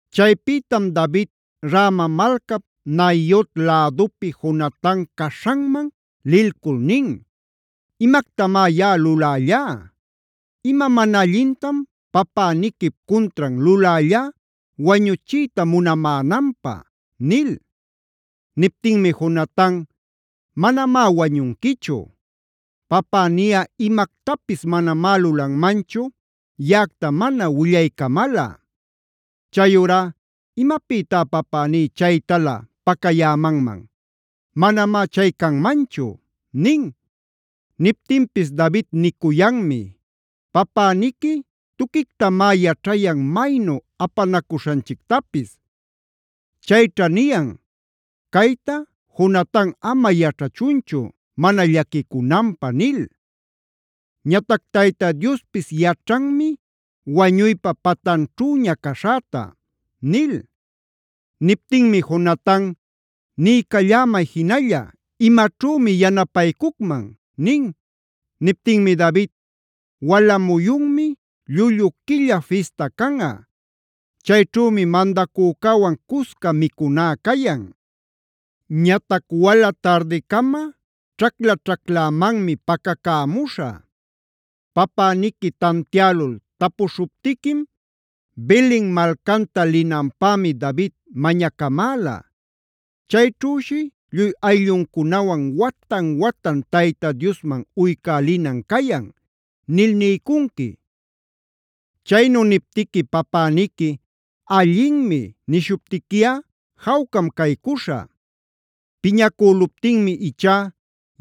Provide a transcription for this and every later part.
Chaypïtam David Rama malcap Naiot lädupi Jonatan caśhanman lilcul nin: “¿Imactamá yaꞌa lulällá? ¿Ima mana allintam papäniquip cuntran lulällá wañuchiyta munamänanpä?” nil. Niptinmi Jonatan: “Manamá wañunquichu. Papäniꞌa imactapis manamá lulanmanchu yaꞌacta mana willaycamalꞌa. Chayurá, ¿imapïtá papäní chaytalä pacayämanman? Manamá chay canmanchu” nin. Niptinpis David nicuyanmi: “Papäniqui tuquictamá yaćhayan maynu apanacuśhanchictapis. Chayćha niyan: ‘Cayta Jonatan ama yaćhachunchu mana llaquicunanpä’ nil. Ñatac Tayta Diospis yaćhanmi wañuypa patanćhüña caśhäta” nil. Niptinmi Jonatan: “Niycallämay jinalla, ¿imaćhümi yanapaycucman?” nin. Niptinmi David: “Wala muyunmi llullu quilla fista canꞌa.a Chayćhümi mandacücäwan cusca micuná cayan. Ñatac wala tardicama ćhacla-ćhaclämanmi pacacämuśhä. Papäniqui tantiälul tapuśhuptiquim: ‘Belen malcanta linanpämi David mañacamäla. Chayćhüshi lluy aylluncunawan watan-watan Tayta Diosman uycälinan cayan’ nil niycunqui. Chaynu niptiqui papäniqui ‘allinmi’ nishuptiquiꞌa jawcam caycuśhä. Piñacüluptinmi ichá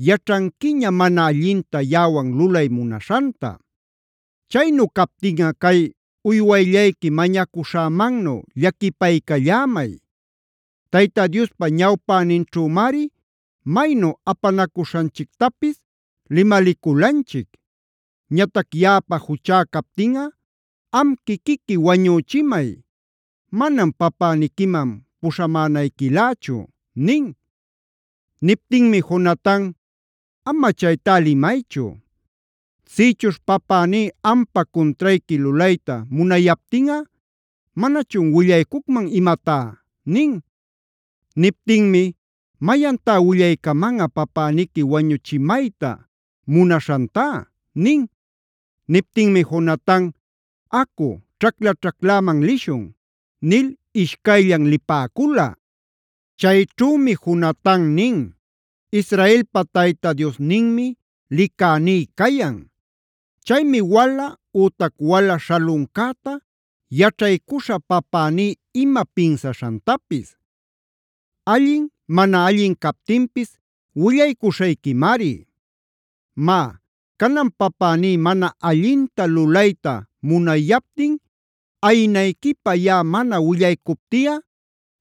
yaćhanquiña mana allinta yaꞌawan lulay munaśhanta. Chaynu captinꞌa cay uywayllayqui mañacuśhämannu llaquipaycallämay. Tayta Diospa ñawpäninćhümari maynu apanacuśhanchictapis limaliculanchic. Ñatac yaꞌapa juchá captinꞌa am quiquiqui wañüchimay; manam papäniquiman puśhamänayquilächu” nin. Niptinmi Jonatan: “Ama chaytá limaychu. Sïchuśh papäní ampa cuntrayqui lulayta munayaptinꞌa ¿manachun willaycucman imatá?” nin. Niptinmi: “¿Mayantá willaycamanꞌa papäniqui wañuchimayta munaśhantá?” nin. Niptinmi Jonatan: “Acu ćhacla-ćhacläman lishun” nil ishcayllan lipäcula. Chayćhümi Jonatan nin: “Israelpa Tayta Diosninmi licäní cayan. Chaymi wala ütac wala śhaluncäta yaćhaycuśhä papäní ima pinsaśhantapis. Allin mana allin captinpis willaycuśhayquimari. Má, canan papäní mana allinta lulayta munayaptin ayinayquipä yaꞌa mana willaycuptiꞌa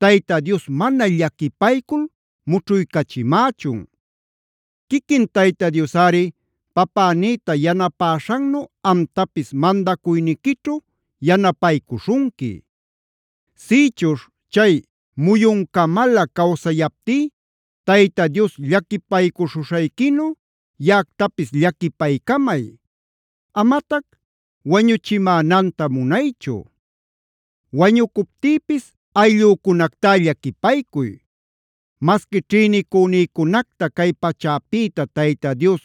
Tayta Dios mana llaquipaycul mućhuycachimächun. Quiquin Tayta Diosꞌari papänïta yanapäśhannu amtapis mandacuyniquićhu yanapaycuśhunqui. Sïchuśh chay muyuncamalä cawsayaptí Tayta Dios llaquipaycuśhuśhayquinu yaꞌactapis llaquipaycamay; amatac wañuchimänanta munaychu. Wañucuptïpis ayllücunactá llaquipaycuy. Masqui ćhïnicünïcunacta cay pachäpïta Tayta Dios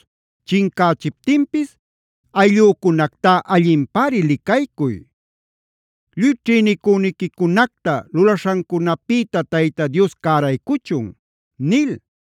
chincächiptinpis ayllücunactá allinpari licaycuy. Lluy ćhïnicüniquicunacta lulaśhancunapïta Tayta Dios cäraycuchun” nil.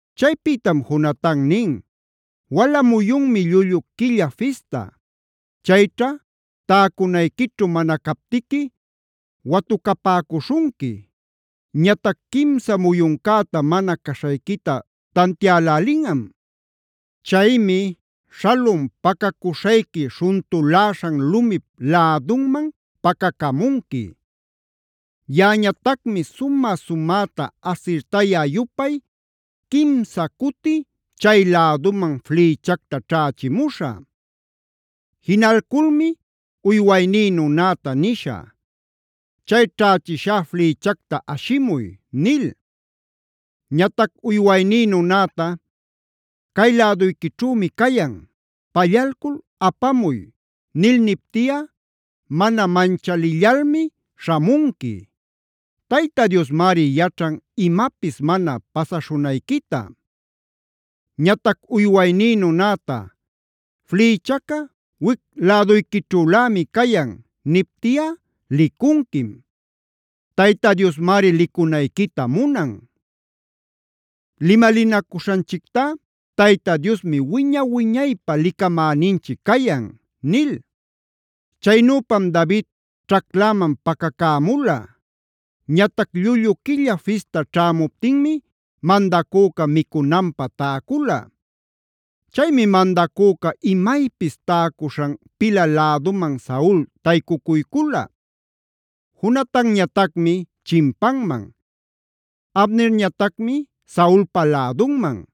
Chaypïtam Jonatan nin: “Wala muyunmi llullu quilla fista. Chayćha täcunayquićhu mana captiqui watucapäcuśhunqui. Ñatac quimsa muyuncäta mana caśhayquita tantiälälinꞌam. Chaymi śhalun pacacuśhayqui śhuntuläśhan lumip lädunman pacacamunqui. Yaꞌañatacmi sumä-sumäta asirtayä-yupay quimsa cuti chay-läduman flïchacta ćhächimuśhä. Jinalculmi uywayní nunäta nishä: ‘Chay ćhächishá flïchacta ashimuy’ nil. Ñatac uywayní nunäta: ‘Cay läduyquićhümi cayan; pallalcul apamuy’ nil niptiꞌa mana manchalillalmi śhamunqui. Tayta Diosmari yaćhan imapis mana pasaśhunayquita. Ñatac uywayní nunäta: ‘Flïchaca wic-läduyquićhülämi cayan’ niptiꞌa licunquim. Tayta Diosmari licunayquita munan. Limalinacuśhanchictá Tayta Diosmi wiña-wiñaypä licamäninchic cayan” nil. Chaynüpam David ćhacläman pacacämula. Ñatac llullu quilla fista ćhämuptinmi mandacüca micunanpä täcula. Chaymi mandacüca imaypis täcuśhan pilä läduman Saul taycucuycula. Jonatanñatacmi chimpanman, Abnerñatacmi Saulpa lädunman.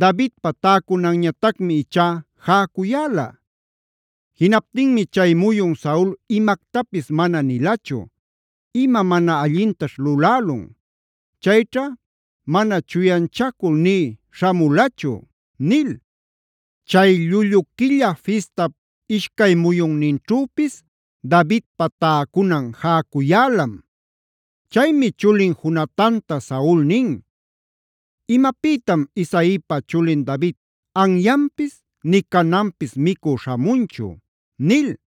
Davidpa täcunanñatacmi ichá jäcuyäla. Jinaptinmi chay muyun Saul imactapis mana nilachu: “Ima mana allintaćh lulälun. Chayćha mana chuyanchacul nï śhamulachu” nil. Chay llullu quilla fistap ishcay muyunninćhüpis Davidpa täcunan jäcuyälam. Chaymi chulin Jonatanta Saul nin: “¿Imapïtam Isaipa chulin David anyanpis nï cananpis micü śhamunchu?” nil.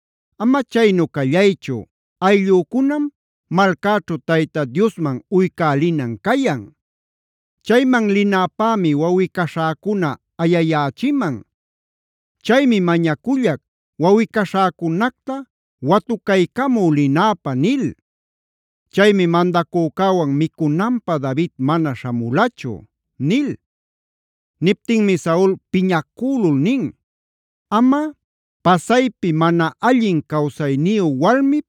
‘Ama chaynu callaychu, ayllücunam malcäćhu Tayta Diosman uycälinan cayan. Chayman linäpämi wawꞌi-caśhäcuna ayayächiman. Chaymi mañacullac wawꞌi-caśhäcunacta watucaycamü linäpä’ nil. Chaymi mandacücäwan micunanpä David mana śhamulachu” nil. Niptinmi Saul piñacülul nin: “Amꞌa pasaypi mana allin cawsayniyu walmip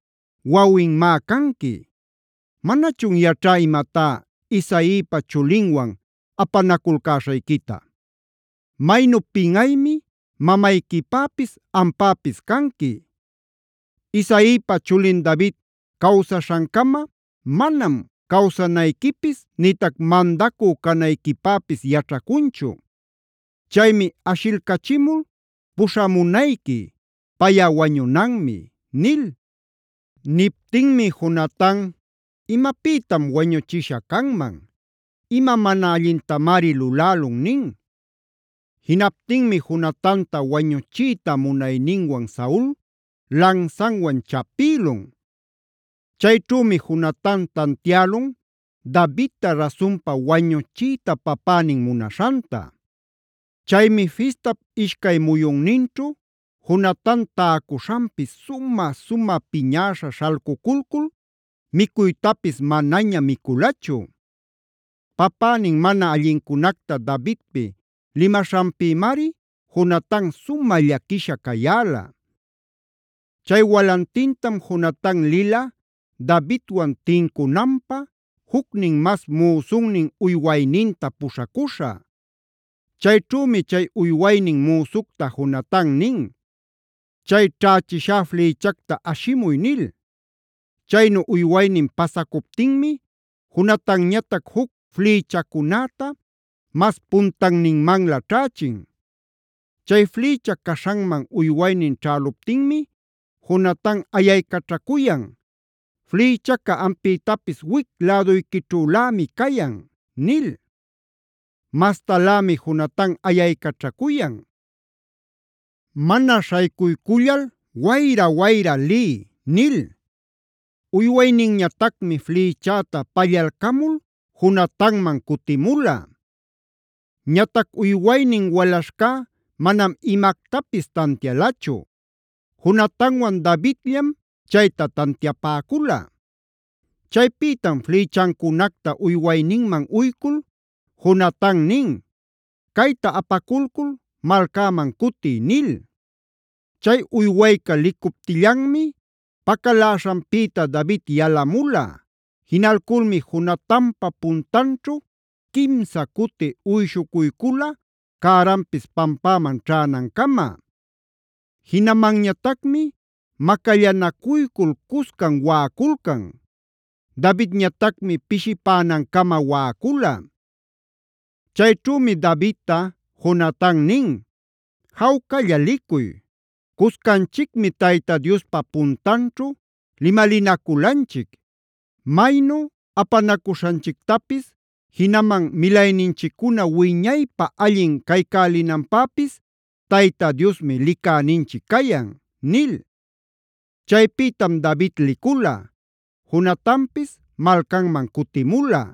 wawinmá canqui. ¡Manachun yaćhá imatá Isaipa chulinwan apanaculcäśhayquita! Maynu pinꞌaymi mamayquipäpis ampäpis canqui. Isaipa chulin David cawsaśhancama manam cawsanayquipis nïtac mandacü canayquipäpis yaćhacunchu. Chaymi ashilcachimul puśhamunayqui; payꞌa wañunanmi” nil. Niptinmi Jonatan: “¿Imapïtam wañuchisha canman? ¿Ima mana allintamari lulälun?” nin. Jinaptinmi Jonatanta wañuchiyta munayninwan Saul lansanwan chapïlun. Chayćhümi Jonatan tantiälun Davidta rasunpa wañuchiyta papänin munaśhanta. Chaymi fistap ishcay muyunninćhu Jonatan täcuśhanpi sumä-sumä piñäśha śhalcuculcul micuytapis manaña miculachu. Papänin mana allincunacta Davidpi limaśhanpïmari Jonatan sumä llaquisha cayäla. Chay walantintam Jonatan lila Davidwan tincunanpä, jucnin mas müsunnin uywayninta puśhacuśha. Chayćhümi chay uywaynin müsucta Jonatan nin: “Chay ćhächishá flïchacta ashimuy” nil. Chaynu uywaynin pasacuptinmi Jonatanñatac juc flïchacunäta mas puntanninmanlä ćhächin. Chay flïcha caśhanman uywaynin ćhäluptinmi Jonatan ayaycaćhacuyan: “Flïchaca ampïtapis wic läduyquićhulämi cayan” nil. Mastalämi Jonatan ayaycaćhacuyan: “Mana śhaycuycullal wayra-wayra liy” nil. Uywayninñatacmi flïchäta pallalcamul Jonatanman cutimula. Ñatac uywaynin walaśhcá manam imactapis tantialachu; Jonatanwan Davidllam chayta tantiapäcula. Chaypïtam flïchancunacta uywayninman uycul Jonatan nin: “Cayta apaculcul malcäman cutiy” nil. Chay uywayca licuptillanmi pacaläśhanpïta David yalamula. Jinalculmi Jonatanpa puntanćhu quimsa cuti uyshuycula cäranpis pampäman ćhänancama. Jinamanñatacmi macallanacuycul cuscan waꞌaculcan. Davidñatacmi pishipänancama waꞌacula. Chayćhümi Davidta Jonatan nin: “Jawcalla licuy. Cuscanchicmi Tayta Diospa puntanćhu limalinaculanchic: ‘Maynu apanacuśhanchictapis jinaman milayninchiccuna wiñaypä allin caycälinanpäpis Tayta Diosmi licäninchic cayan’” nil. Chaypïtam David licula; Jonatanpis malcanman cutimula.